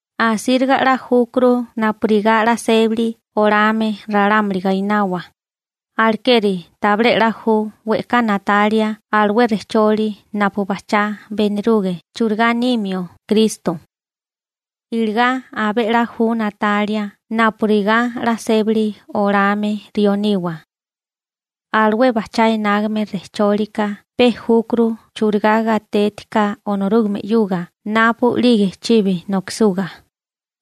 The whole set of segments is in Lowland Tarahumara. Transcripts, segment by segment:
Asíriga 'la júkuru napurigá 'la sébali olame ralámuli gainawa, alekeri tabilé 'la ju we'ká na'talia alué rejcholi napu bajchá beniruge churigá nimio Kristo. Iligá abé 'la ju na'talia napurigá 'la sébali olame rió niwa. Alué bajchá enágame rejchólika pe júkuru churigá gatétiká Onorúgame 'yuga napu'lige chibi nokisuga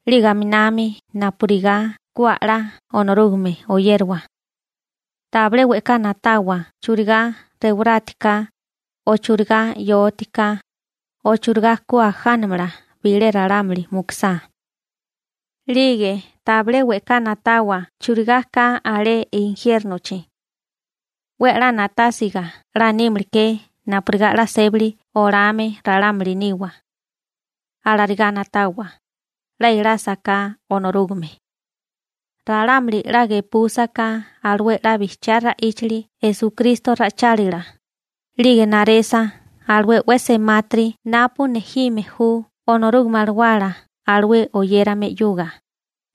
(napurigá tánime ju e'kali bilé towí bo'né o'nola), 'lige aminami napurigá ku a'lá Onorúgame oyériwa. Tabilé we'ká na'tawa churigá rewarátiká, o churigá 'yóatiká, o churigá ku ajánamala bilé ralámuli mukusá. 'Lige tabilé we'ká na'tawa churigá ka alé injiérnochi. 'We a'lá na'tásiga 'la nímala ke napurigá 'la sébali olame ralámuli niwa. Alarigá na'tawa, 'la elásaká Onorúgame. Ralámuli 'la gepúsaká alué 'la bijchiá ra'íchali Esukristo ra'ichálila, 'lige naresa alué 'we semátiri napu nejime ju Onorúgame Alawala alué oyérame 'yuga,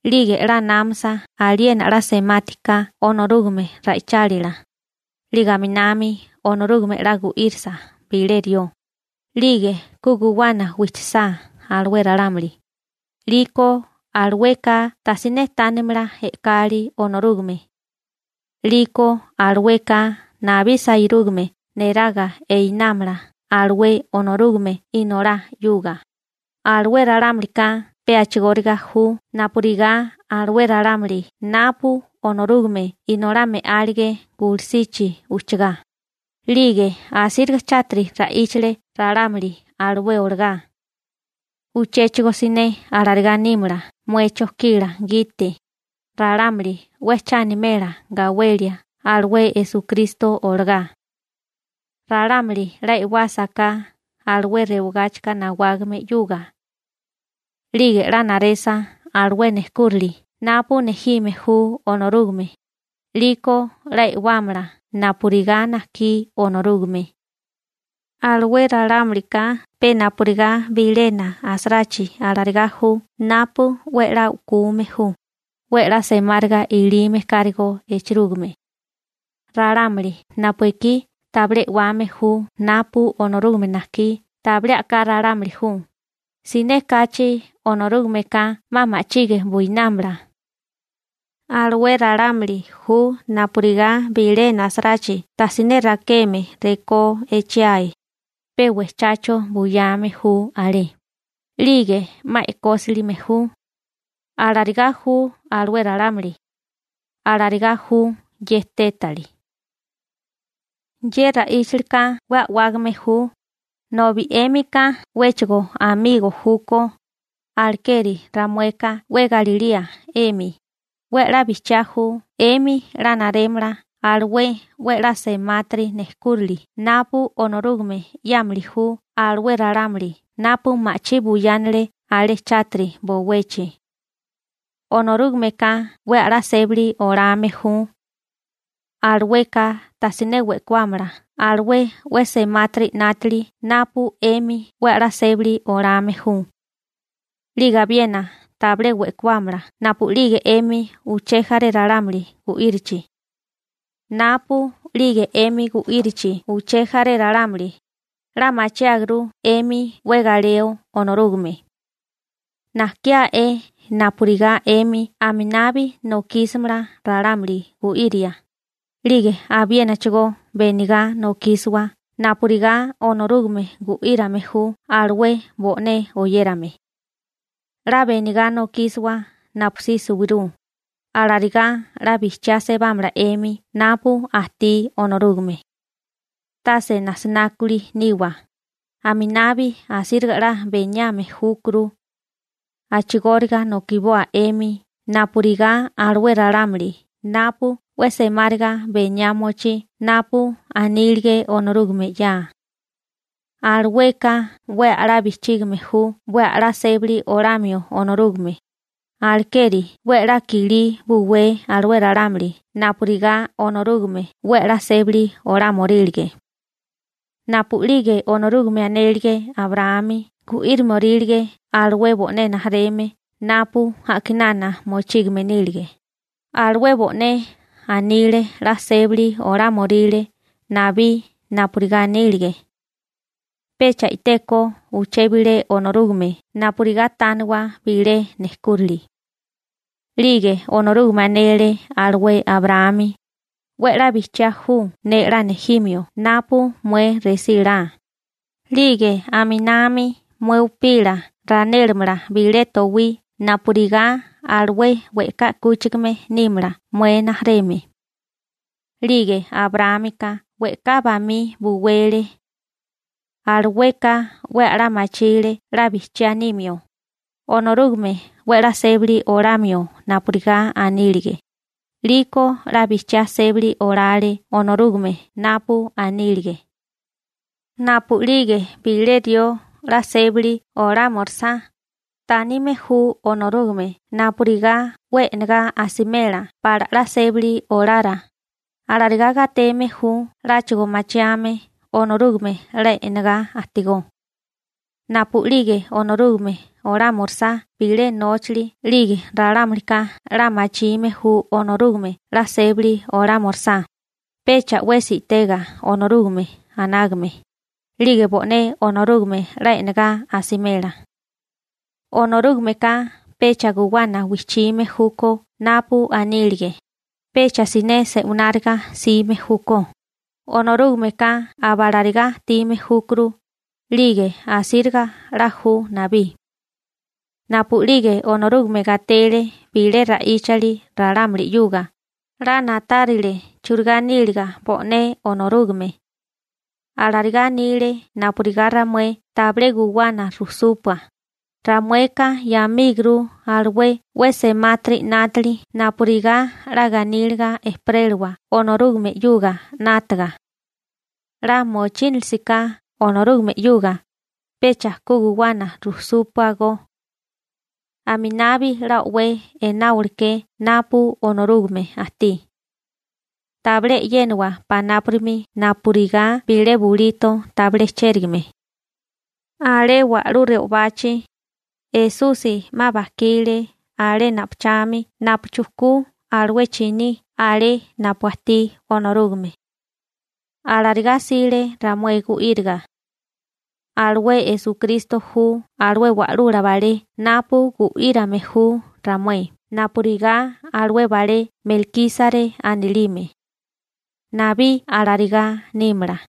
'lige 'la námasa aliena 'la semati ka Onorúgame ra'ichálila, 'lige aminami Onorúgame 'la gu'írisa bilé rió, 'lige ku guwana wijchisá alué ralámuli, 'liko alueka tajsiné tánimala e'kali Onorúgame. 'Liko alueka nabí sairúgame neraga einámala alué Onorúgame Inolá 'yuga. Alué ralámulika pe a'chigóriga ju napurigá alué ralámuli napu Onorúgame Inolá me'álige gulusichi ujchagá, 'lige asíriga chátiri ra'íchale ralámuli alué olagá. Uchéchigo siné alarigá nímala mué chojkila gite, ralámuli 'we cha animela gawelia alué Esukristo olagá. Ralámuli 'la e'wásaká alué rewagáchika nawágame 'yuga, 'lige 'la naresa alué nejkúrali napu nejime ju Onorúgame, 'liko 'la e'wámala napurigá najkí Onorúgame. Alué ralámulika pe napurigá bilena asarachi alarigá ju napu 'we 'la u'kume ju, 'we 'la semáriga ilime kárigó echerúgime. Ralámuli napu ekí tabilé e'wame ju napu Onorúgame najkí tabilé a'ká ralámuli ju, siné kachi Onorúgameka 'ma ma'chige buinámala. Alué ralámuli ju napurigá bilena asarachi tajsiné rakeme rekó echiae, pe wejchacho buyame ju alé, 'lige 'ma e'kósilime ju. Alarigá ju alué ralámuli. Alarigá ju ye tétali. Ye ra'íchalika 'we a'wágame ju, nobi 'émika 'wéchigo machirume júkó, alekeri ramueka 'we galilía 'emi, 'we a'lá bijchiá ju 'emi 'la narémala alué 'we 'la semátiri nejkúrali napu Onorúgame 'yámili ju alué ralámuli napu ma'chí buyánale alé chátiri bowechi. Onorúgameka 'we a'lá sébali olame ju. Alueka tajsiné we'kuámala alué 'we semátiri 'nátili napu 'emi 'we a'lá sébali olame ju. 'Lige abiena tabilé we'kuámala napu'lige 'emi uché jaré ralámuli gu'írichi. Napu'lige 'emi gu'írichi uché jaré ralámuli, 'la machiáguru 'emi 'we galeo Onorúgame. Najkiá'é napurigá 'emi aminabi nokísimala ralámuli gu'iria, 'lige abiénachigó benigá nokísiwa napurigá Onorúgame gu'írame ju alué bo'né oyérame. 'La benigá nokísiwa napusí suwirú. Alarigá 'la bijchiá sebámala 'emi napu ajtí Onorúgame. Tase najsinákuli niwa, aminabi asíriga 'la beniame júkuru. A'chigóriga nokiboa 'emi napurigá alué ralámuli napu 'we semáriga beniá mochí napu anílige Onorúgame 'ya. Alueka 'we a'lá bijchígame ju 'we a'lá sébali olamio Onorúgame, alekeri 'we a'lá i'kilí buwé alué ralámuli napurigá Onorúgame 'we a'lá sébali olámiorílige. Napu'lige Onorúgame anélige Abraámi gu'írimiorílige alué bo'né rijimala napu a'kinana mochígame nílege (napu Esusi nílige), alué bo'né anile 'la sébali olámoríle nabí napurigá anílige. Pecha i'té ko uché bilé Onorúgame napurigá tániwa bilé nejkúrili. 'Lige Onorúgame anele alué Abraámi: «'We 'la bijchiá ju ne 'la nejimio napu mué resí la, 'lige aminami mué upila ranélamala bilé towí napurigá alué we'ká 'kúchigame nímala mué rijimala.» 'Lige Abraámika we'ká bamí buwele. Alueka 'we a'lá machile 'la bijchiá nimio, Onorúgame 'we 'la sébali olamio napurigá anílige, 'liko 'la bijchiá sébali olale Onorúgame napu anílige. Napu'lige bilé rió 'la sébali olámorisá, tánime ju Onorúgame napurigá 'we e'negá asimela pala 'la sébali olara, alarigá gateme ju 'láchigo machiame Onorúgame 'la e'negá ajtigó. Napu'lige Onorúgame olámorisá bilé nóchali 'lige ralámulika 'la machime ju Onorúgame 'la sébali olámorisá, pecha 'wesi i'tega Onorúgame anágame, 'lige bo'né Onorúgame 'la e'negá asimela. Onorúgameka pecha guwana wijchime júkó napu anílige, pecha siné se'wináriga 'sime júkó, Onorúgameka aba alarigá ajtime júkuru, 'lige asíriga 'la ju nabí. Napu'lige Onorúgame gatele bilé ra'íchali ralámuli 'yuga, 'la na'tárile churigá níliga bo'né Onorúgame. Alarigá anile napurigá ramué tabilé guwana rujsúpua, ramueka 'yamíguru alué 'we semátiri 'nátili napurigá 'la ganíliga ejperélawa Onorúgame 'yuga 'nátaga. 'La mochínalisiká Onorúgame 'yuga, pecha ku guwana rujsúpuagó. Aminabi 'la o'wé e'náboliké napu Onorúgame ajtí. Tabilé e'yéniwa panápurimi napurigá bilé bulito tabilé chérigame. Alé wa'lú re'obachi, Esusi 'ma bajkile alé napuchami napu chujkule alué chiní alé napu ajtí Onorúgame. Alarigá 'sile ramué gu'íriga. Alué Esukristo ju alué wa'lula balé napu gu'írame ju ramué napurigá alué balé Melkísare anilime. Nabí alarigá nímala.